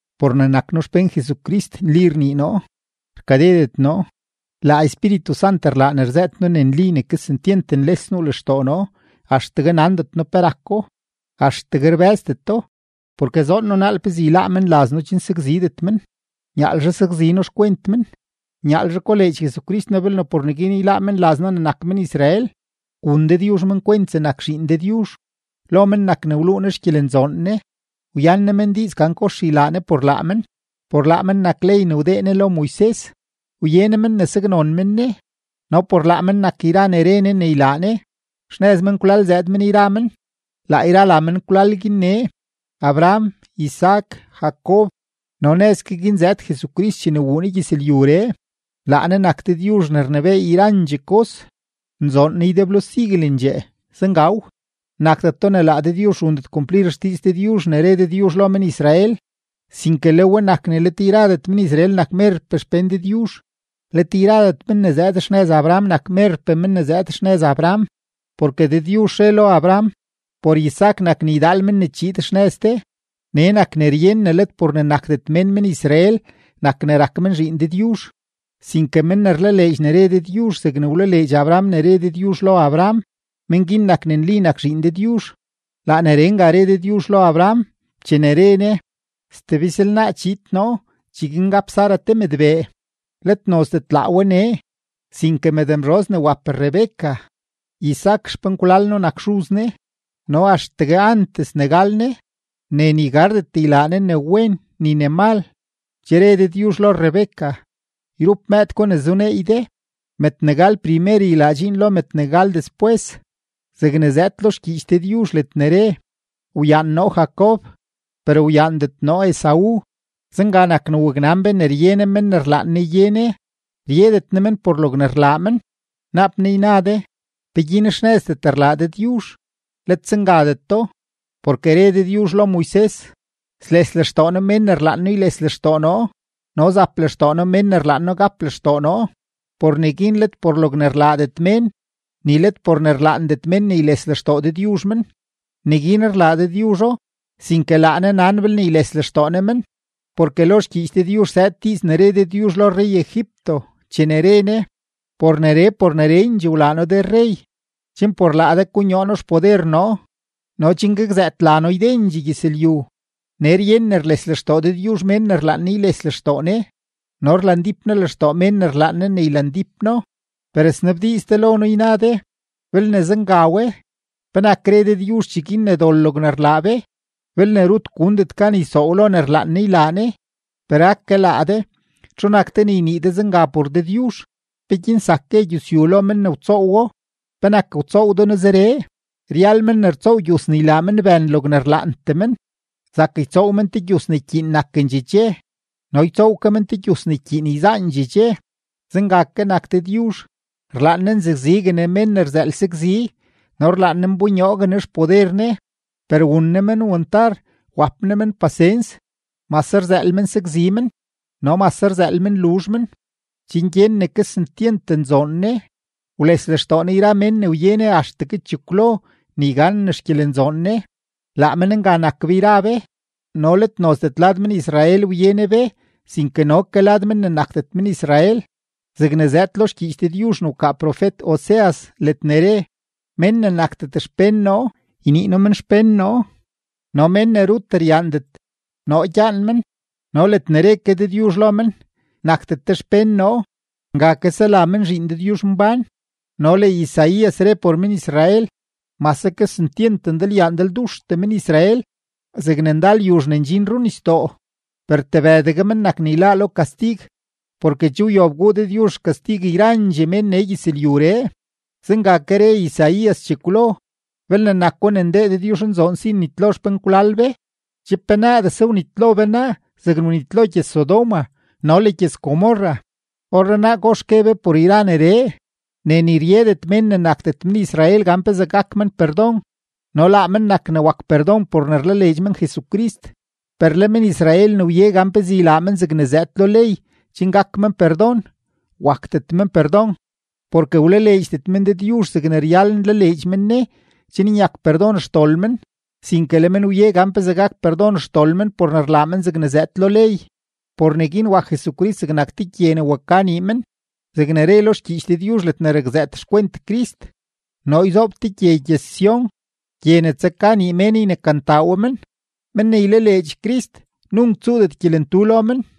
Por ne nak noo xpén Jesucrist, nli rnii noo, rkadedet noo; laa Espíritu Sant rlaa ne rzëët noo ne nli ne kesentyent nles nuu lextoo noo axtegue nandet noo pe rako, axtegue rbë́zdeto, porke zoon noo naal pezee yláá menlaz noo chen sakzidet men, nyaalzhe sakzi noo xkwent men, nyaalzhe koleedx Jesucrist noo belne por neguin yláá menlaz noo ne nak men-Israel. Wun Dëdyuzh men kwent zegnak zhiin Dëdyuzh, lo men nak ne wluu Ne xgyelenzoon Ne, wyan Ne men diiz gan kox ylaa Ne por laa men, por laa men nak ley ne wdee Ne lo Moises, wye Ne men ne saknon men Ne, no por laa men nak yra ne re Ne ne ylaa Ne. Xnëz menkwlal zëëd men yra men; laa yra la menkwlal guin nee: Abraham, Isaac, Jacob, no nëz ke guin zëëd Jesucrist chene wuu Ne gyëzlyuree, laa Ne nak Dëdyuzh ne rnebééy yrandxee kos, nzoon Ne ydeblo siguelendxee. Zengaw. Nakdeto ne laa Dëdyuzh rundet kumplir xdiiz Dëdyuzh ne re Dëdyuzh lo men-Israel, sinke le we nak ne let yradet men-Israel nak merpee xpén Dëdyuzh. Let yradet men ne zëëd xnëz Abraham nak merpee men ne zëëd xnëz Abraham, porke Dëdyuzh re lo Abraham: “Por Isaac nak ne ydaal men ne chiid xnëz de.” Nee nak ne ryen ne let por ne nakdet mén men-Israel nak ne rak men zhiin Dëdyuzh, sinke men ne rlaleedx ne re Dëdyuzh zegne wlaleedx Abraham ne re Dëdyuzh lo Abraham, men guin nak ne nli nak zhiin Dëdyuzh. Laa neree nga re Dëdyuzh lo Abraham, chene re Ne: “Stebizlnaa chiid noo, cheguin gap Sara te mëdbee.” Let nozdet laa we nee, sinke mëdmzhoz ne wap Rebeca, Isaac xpenkwlal noo nak xuz ne, no axtegue antes ne gal ne, ne ni gardet ylaa ne ne wen ni ne mal, che re Dëdyuzh lo Rebeca: “Yrup mëëd gwa ne zuneey de, mëëd ne gal primer ylaa dxiin lo mëëd ne gal despwes.” Zegne zëëd lo xgyiich Dëdyuzh ledne re: “Wyaan noo Jacob, per wyaandet noo Esaú.” Zenga nak ne waknan be ne rye Ne men ne rlaan Ne ye Ne; ryedet Ne men por logne rlaa men. Naap naa yna de: “¿Peguin xnëzdet rlaa Dëdyuzh?” ¡Let zengadeto! Porke re Dëdyuzh lo Moises: “Sles lextoo noo mén ne rlaan noo yles lextoo noo, no zap lextoo noo mén ne rlaan noo gap lextoo noo.” Por neguin let por logne rlaadet mén, ni let por ne rlaandet men ne yles lextoo Dëdyuzh men, neguin rlaa Dëdyuzho, sinke laa Ne nan belne yles lextoo Ne men. Porke lo xgyiich Dëdyuzh zëëd diiz ne re Dëdyuzh lo rrey-Egipto, chene re Ne: “Por neree por nerendxee wlaa noo de rrey, chen por laa de konyoo noo xpoder noo no chen gakzëët la noo ydendxee gyëzlyu.” Nee ryen ne rles lextoo Dëdyuzh mén ne rlaan Ne yles lextoo Ne, no rlandíp Ne lextoo mén ne rlaan Ne ne ylandíp No. Per snabdiiz de lo noo, yna de: “Belne zenga we, ¿penak re Dëdyuzh cheguin ne dol logne rlaa be, belne rut gundet gan ysoow lo ne rlaan Ne ylaa Ne?” Per ake laa de, ¿txu nak de ne ynii de zenga por Dëdyuzh? ¿Peguin zak gue gyusyu lo men ne wtsoowo: “¿Penak wtsoow de noo zeree?” Ryal men ne rtsoow gyus ne ylaa men bën logne rlaantee men; zak ytsoow men te gyus ne ykyiin nakendxee dxe no ytsoow ke men te gyus ne ykyiin yzaandxee dxe. Zenga ke nak Dëdyuzh, rlaan Ne nzakzigue Ne mén ne rzëël sakzi no rlaan Ne nbonyoogue Ne xpoder Ne, per wun Ne men wantar, wap Ne men pasens, mase rzëël men sakzi men no mase rzëël men luzh men, chen gyen ne kesentyent nzoon Ne, wles lextoo Ne yra mén ne wye Ne axtegue chekwlo ne yganen xgyelenzoon Ne. Laa men nga nak be yra be, no let nozdet lad men-Israel wye Ne be sinke no ke lad men ne nakdet men-Israel. Zegne zëëd lo xgyiich Dëdyuzh ne wkaa profet-Oseas ledne re: Mén ne nakdet xpén noo, ynii noo men xpén noo, no mén ne rut ryaandet, noo gyaan men. No ledne re ke Dëdyuzh lo men: “Nakdet de xpén noo”, nga ke sela men zhiin Dëdyuzhmbán. No le Isaías re por men-Israel: “Mase kesentyent ndalyaa ndalduxtee men-Israel zegne ndal yuzh ne ndxin runisdoo, per tebëdegue men nak ne yláá lo kastig, porke che wyob guu Dëdyuzh xkastig yrandxee mén nee gyëzlyuree.” Zenga ke re Isaías chekwlo: Belne nako ne ndee Dëdyuzhnzoon si ne nnitlo xpenkwlal be, che penaadese wnitlo be naa zegne wnitlo gyëz-Sodoma no le gyëz-Gomorra. ¿Orrenaa kox gue be por yra neree? Ne ni ryedet mén ne nakdet men-Israel gan pezee gak men perdon, no laa men nak ne wak perdon por ne rlaleedx men Jesucrist. Per le men-Israel ne wye gan pezee ylaa men zegne zëëd lo ley chen gak men perdon, wakdet men perdon, porke wlaleedxdet men Dëdyuzh zegne ryal nlaleedx men Ne chen nyak perdon xdol men, sinke le men wye gan pezee gak perdon xdol men por ne rlaa men zegne zëëd lo ley. Por neguin wak Jesucrist zegnak “te gye ne waka nii men”, zegne re lo xgyiich Dëdyuzh ledne rakzëët xkwent Crist: Noo yzoob te gye gyëz-Sión, gye ne tsaka nii mén ynekantaa we men. Men ne ylaleedx Crist, nunk tsuudet gyelentu lo men.